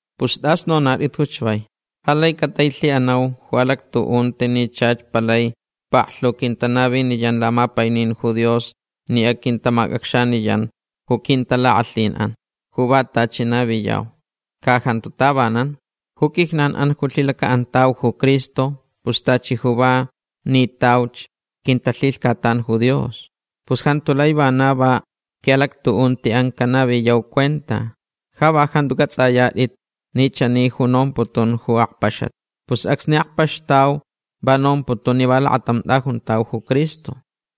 Pus tas anonaʼitʼit ju chavai. Ja lai catailhiʼanau ju alactuʼunti ni chach palai paklhu quintanaviniyan lamapainin ju Dios ni aquintamacʼacxaniyanch ju quintalakʼalhinʼan ju va tachi naviyau. Ca jantu tavanan. Ju quijnanʼan ni lhilacaʼantauch ju Cristo pus tachi ju va nitauch quintalhilhcatan ju Dios. Pus jantu lai vana va quiʼalactuʼuntiʼan canaviyau cuenta. Ja va jantu cʼatsʼayatʼit ni chani ju nomputun ju akpaxat. Pus acsni akpaxtauch va nomputun ni va lakatam tʼajuntauch ju Cristo.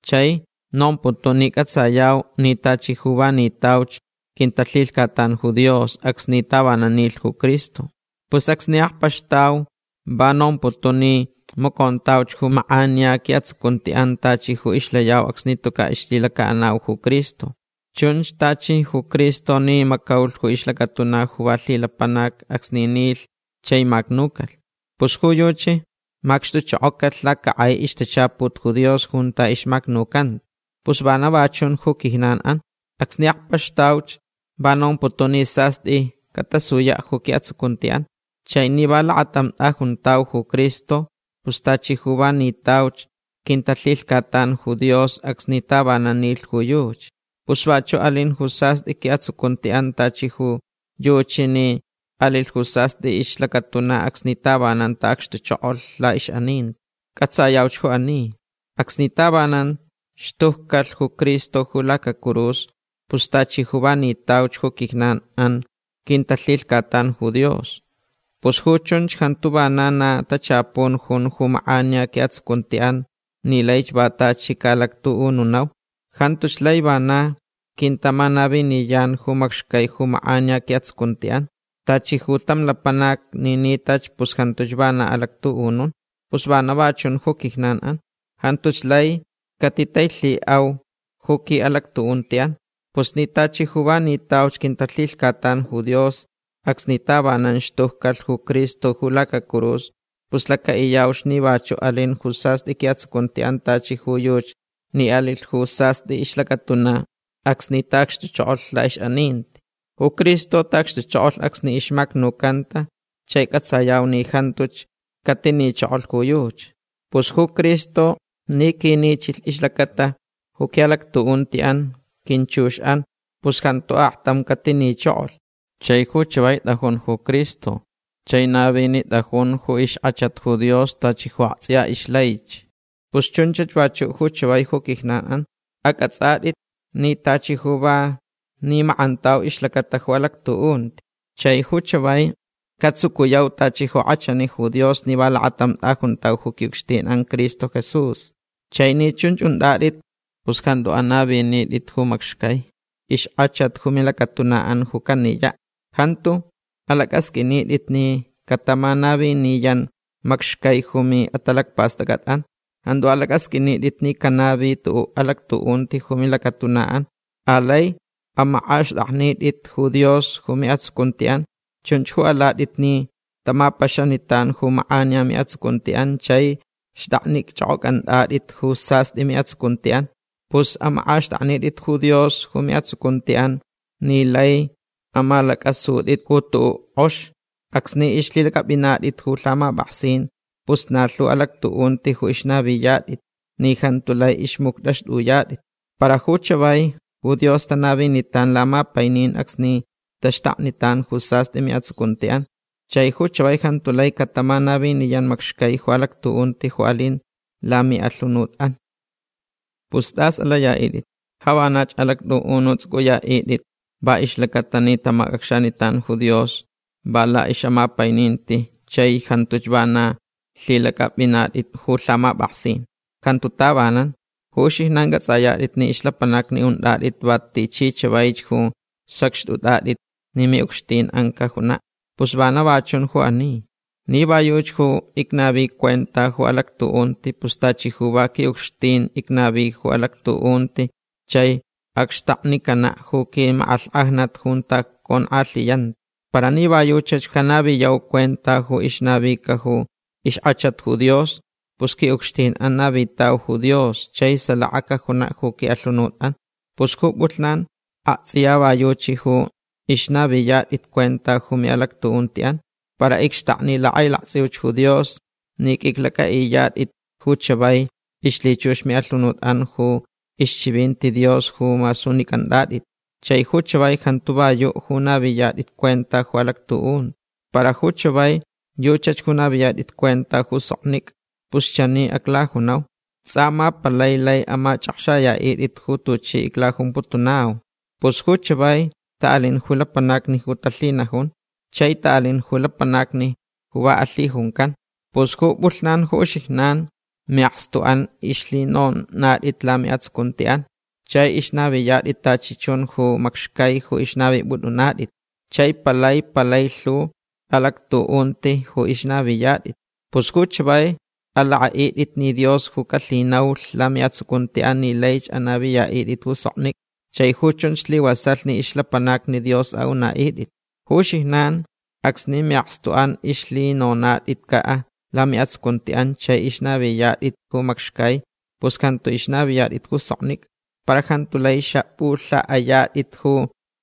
Chai nomputun ni cʼatsayau ni tachi ju va nitauch quintalhilhcatan ju Dios acsni tavanan nilh ju Cristo. Pus acsni akpaxtauch va nomputun ni macontauch ju makʼaniya quiʼatsucuntiʼan tachi ju ixlayau acsni tucaʼ ixlhilacaʼanauch ju Cristo. Chunch tachi ju Cristo ni macaulh ju ixlacatuna ju va lhilapanac acsni nilh chai macnucalh. Pus ju yuchi macxtuchokocalh lacakʼai ixtachaput ju Dios junta ixmacnucanta. Pus vana va chun ju quijnanʼan. Acsni akpaxtauch va nomputun ni sastʼi catasuyaʼ ju quiʼatsucuntiʼan. Chai ni va lakatam tʼajuntauch ju Cristo pus tachi ju va nitauch quintalhilhcatan ju Dios acsni tavanan nilh ju yuchi. Pus vachuʼ alin ju sastʼi quiʼatsucuntiʼan tachi ju yuchi ni alilh ju sastʼi ixlacatuna acsni tavanan taʼacxtuchokolh laʼixʼaninti. Cʼatsayauch ju ani. Acsni tavanan xtujcalh ju Cristo ju lacacurus pus tachi ju va nitauch ju quijnanʼan quintalhilhcatan ju Dios. Pus ju chunch jantu vana na tachapun jun ju makʼaniya quiʼatsucuntiʼan ni laich va tachi caʼalactuʼununau. Jantuch lai vana quintamanaviniyan ju macxcai ju makʼaniya quiʼatsucuntiʼan. Tachi ju tam lapanac ni nitach pus jantuch vana alactuʼunun. Pus vana va chun ju quijnanʼan. Jantuch lai catitailhiʼau ju quiʼalactuʼuntiʼan. Pus ni tachi ju va nitauch quintalhilhcatan ju Dios acsni tavanan xtujcalh ju Cristo ju lacacurus pus lacaʼiyauch ni vachuʼ alin ju sastʼi quiʼatsucuntiʼan tachi ju yuchi ni alilh ju sastʼi ixlacatuna acsni taʼacxtuchokolh laʼixʼaninti. Ju Cristo taʼacxtuchokolh acsni ixmacnucanta chai cʼatsayau ni jantuch catinichokolh ju yuchi. Pus ju Cristo ni quinichilh ixlacata ju quiʼalactuʼuntiʼan quinchuxʼan pus jantu aktam catinichokolh. Chai ju chavai tʼajun ju Cristo chai navinitʼajun ju ixkʼachat ju Dios tachi ju aktsʼiya ixlaich. Pus chunchach vachuʼ ju chavai ju quijnanʼan. Acʼatsʼatʼit ni tachi ju va nimakʼantau ixlacata ju alactuʼunti. Chai ju chavai catsucuyau tachi ju kʼachani ju Dios ni va lakatam tʼajuntau ju quiʼucxtinʼan Cristo Jesús. Chai ni chunch untʼatʼit pus jantu anavinitʼit ju macxcai ixkʼachat ju milacatunaʼan ju caniyaʼ. Jantu alacʼasqʼuinitʼit ni catamanaviniyan macxcai ju miʼatalacpastʼacʼatʼan. Jantu alacʼasqʼuinitʼit ni canavilh tuʼuʼ alactuʼunti ju milacatunaʼan. Alai amakʼaxtʼaknitʼit ju Dios ju miʼatsucuntiʼan. Chunch ju alatʼit ni tamapaxanitan ju makʼaniya miʼatsucuntiʼan chai xtʼaknichʼokʼocʼantʼatʼit ju sastʼi miʼatsucuntiʼan. Pus amakʼaxtʼaknitʼit ju Dios ju miʼatsucuntiʼan ni laich amalacʼasutʼit ju tuʼuʼ kʼox. Acsni ixlhilacʼapʼinatʼit ju lhamapʼaksin pus na lhu alactuʼunti ju ixnaviyatʼit ni jantu lai ixmuctʼaxtʼuyatʼit. Para ju chavai ju Dios tanavinitan lamapainin acsni taxtaknitan ju sastʼi miʼatsucuntiʼan. Chai ju chavai jantu lai catamanaviniyan macxcai ju alactuʼunti ju alin lamiʼalhunutʼan. Pus tas alayaʼitʼit. Ja vanach alactʼuʼununtsʼucʼuyaʼitʼit va ixlacata ni tamacʼacxanitan ju Dios va laʼixʼamapaininti chai jantuch vana lhilacʼapʼinatʼit ju lhamapʼaksin. Jantu tavanan. Ju uxijnan cʼatsʼayatʼit ni ixlapanacni untʼatʼit va tichi chavaich ju sacxtʼutʼatʼit ni miʼucxtinʼan cajunaʼ. Pus vana va chun ju ani. Ni va yuchi ju icnavi cuenta ju alactuʼunti pus tachi ju va quiʼucxtin icnavita ju alactuʼunti chai acxtaknicanaʼ ju quimakʼalhkʼajnat junta conkʼalhiyanta. Para ni va yuchach ju canaviyau cuenta ju ixnavica ju ixkʼachat ju Dios pus quiʼucxtinʼan navitauch ju Dios chai salaka cajunaʼ ju quiʼalhunutʼan. Pus ju pʼulhnan aktsʼiya va yuchi ju ixnaviyatʼit cuenta ju miʼalactuʼuntiʼan. Para icxtakni lakʼailaktsʼiuch ju Dios ni qʼuiclacʼaʼiyatʼit ju chavai ixlhichux miʼalhunutʼan ju ixchivinti Dios ju masunicʼantʼatʼit. Chai ju chavai jantu va yuʼ ju naviyatʼit cuenta ju alactuʼunti. Para ju chavai yuchach ju naviyatʼit cuenta ju soknicʼa. Pus chani aclajunau. Tsʼa ma palai lai amachʼakxayaʼitʼit ju tuchi iclajumputunau. Pus ju chavai taʼalin ju lapanacni ju talhinajun. Chai taʼalin ju lapanacni ju va alhijuncan. Pus ju pʼulhnan ju uxijnan miʼakstuʼan ixlhinonatʼit lamiʼatsucuntiʼan chai ixnaviyatʼit tachi chun ju macxcai ju ixnavipʼutʼunatʼit. Chai palai palai lhu alactuʼunti ju ixnaviyatʼit. Pus ju chavai alakʼaʼitʼit ni Dios ju calhinaulh lamiʼatsucuntiʼan ni laich anaviyaʼitʼit ju soknicʼa. Chai ju chunch slivasalh ni ixlapanacni Dios aʼunaʼitʼit. Ju uxijnan acsni miʼakstuʼan ixlhinonatʼitcaʼ lamiʼatsucuntiʼan chai ixnaviyatʼit ju macxcai pus jantu ixnaviyatʼit ju soknicʼa. Para jantu lai xapʼulhaʼayatʼit ju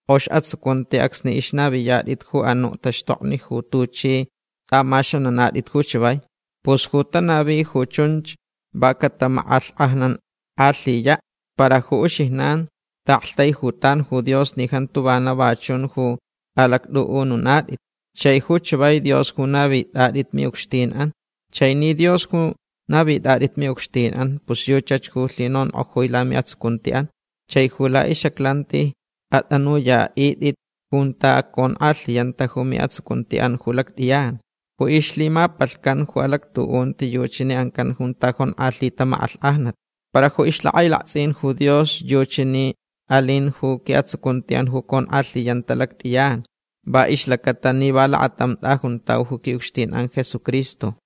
kʼox atsucunti acsni ixnaviyatʼit ju anuʼ taxtokni ju tuchʼi tʼamaxananatʼit ju chavai. Pus ju tanavich ju chunch va catamakʼalhkʼajnankʼalhiyaʼ. Para ju uxijnan taʼaktaijutan ju Dios ni jantu vana va chun ju alactʼuʼununatʼit. Chai ju chavai Dios ju navitʼatʼit miʼucxtinʼan. Chai ni Dios ju navitʼatʼit miʼucxtinʼan pus yuchach ju lhinonkʼojui lamiʼatsucuntiʼan. Chai ju laʼixʼaclantich atʼanuyaʼitʼitch junta conkʼalhiyanta ju miʼatsucuntiʼan ju lactʼiyan. Ju ixlhimapalhcan ju alactuʼunti yuchi ni ancan junta jonkʼalhita makʼalhkʼajnat. Para ju ixlhakʼailaktsʼinch ju Dios yuchi ni alinch ju quiʼatsucuntiʼan ju conkʼalhiyanta ju lactʼiyan va ixlacata ni va lakatam tʼajuntau ju quiʼucxtinʼan Jesucristo.